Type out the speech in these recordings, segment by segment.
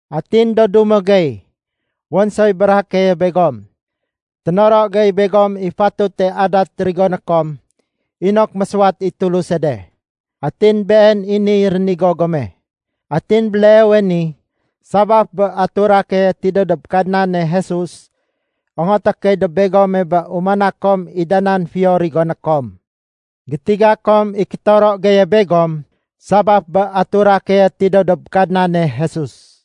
Atin do dumo gey, wén soy béréhé keye begom. Ténoro gey begom i fatute adat rigoné kom inok mésuwat i Tuluse de. Atin been i niy rénigo gome. Atin béleewe ni sabaf bé atura keye tidéw dob Kadnane Jesus, ongoté key dob begome bé umana kom i da nan fiyo rigoné kom. Gétiga kom i kétoro geye begom sabaf bé atura keye tidéw dob Kadnane Jesus.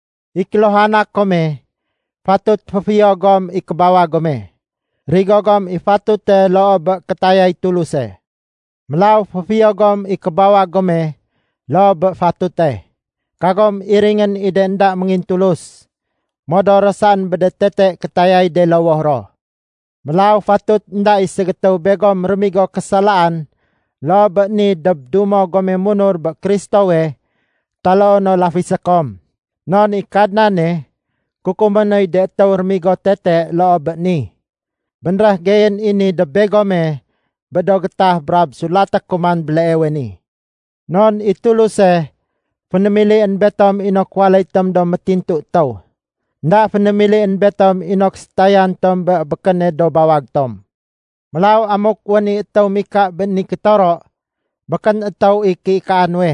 I kéluhana kome fatut féfiyo gom i kébawag gome. Rigo gom i fatute loo bé kétayay Tuluse. Mélaw féfiyo gom i kébawag gome loo bé fatute. Kagom iringén i de énda méngintulus, modor ro saén bé de tete kétayay de lowoh ro. Mélaw fatut énda i ségétéw begom rémigo késalaan loo bé ni dob dumo gome munur bé Kristowe taloo no lafisé kom. Non i Kadnane kukumé noy de étéw rémigo tete loo bé ni. Bénréh geyén i ni dob begome bé do gétah brab sulaté ku man béleewe ni. Non i Tuluse fénémilién betom inok waléy tom do métintu étéw. Enda fénémilién betom inok sétayan tom bé békéne do bawag tom. Mélaw amuk wén i étéw mika bé ni kétoro, békén étéw i kéikaa nuwe,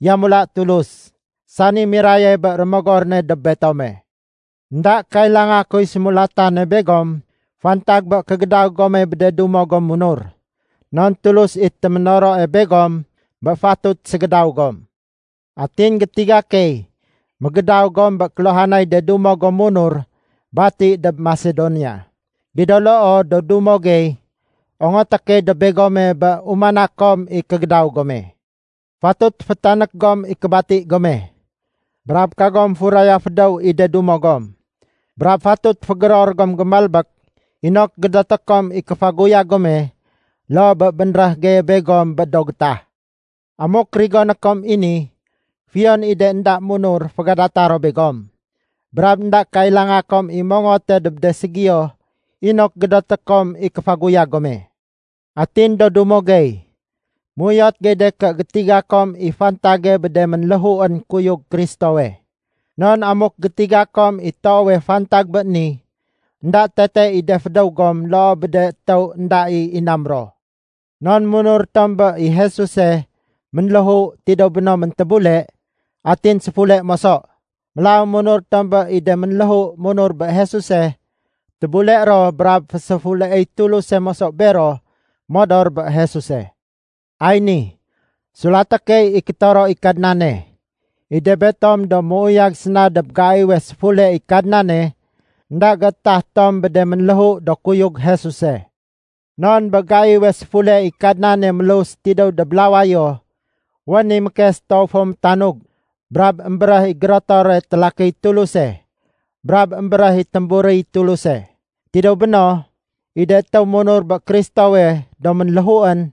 yamula Tulus, sani miraye bé Rémogor ne dob betome. Enda kailanga kuy sémulatane begom fantag bé kégédaw gome bé de dumo gom munur. Non Tulus i téménoroe begom bé fatut ségédaw gom. Atin gétiga key mégédaw gom bé kéluhanay de dumo gom munur bati dob Masedonia. Gido loo do dumo gey, ongoté key dob begome bé umana kom i kégédaw gome. Fatut fétanék gom i kébati gome, brab kagom furaya fédéw i de dumo gom. Brab fatut fégéror gom gémalbék inok gédoté kom i kéfaguyag gome, loo bé bénréh geye begom bé do gétah. Amuk rigoné kom i ni, fiyon i de énda munur fégadata ro begom, brab énda kailanga kom i mongote dob de ségiyo inok gédoté kom i kéfaguyag gome. Atin do dumo gey, méuyot gey de ké gétiga kom i fantage bé de ménléhuén kuyug Kristowe. Non amuk gétiga kom i toowe fantag bé ni, énda tete i de fédéw gom loo bé de étéw énda i inam ro. Non munur tom bé i Jesuse, ménléhu, tidéw béno méntébule, atin séfule moso. Mélaw munur tom bé i de ménléhu munur bé Jesuse, tébule ro brab féséfuleéy Tuluse moso bero modor bé Jesuse. Ay ni sulaté key i kétoro i Kadnane: I de betom do méuyag séna dob gaiwe séfule i Kadnane, énda géétah tom bé de ménléhu do kuyug Jesuse. Non bé gaiwe séfule i Kadnane mélus tidéw dob lawayo, wén i mékes toow fo métanug, brab émbéréh i gérotore télakiy Tuluse, brab émbéréh i témburiy Tuluse. Tidéw béno, i de étéw munur bé Kristowe do ménléhuén,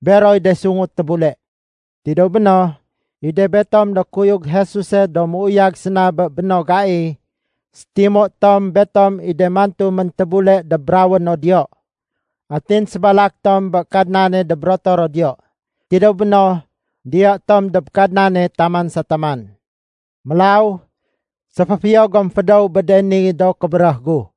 beroy de sungu tébule. Tidéw béno, i de betom do kuyug Jesuse do méuyag séna bé béno gai, sétimu tom betom i de mantu méntébule dob rawéno diyo. Atin sébalak tom bé Kadnane dob rotoro diyo. Tidéw béno, diyo tom dob Kadnane taman sa taman. Mélaw séféfiyo gom fédéw bé de ni do kébéréh gu.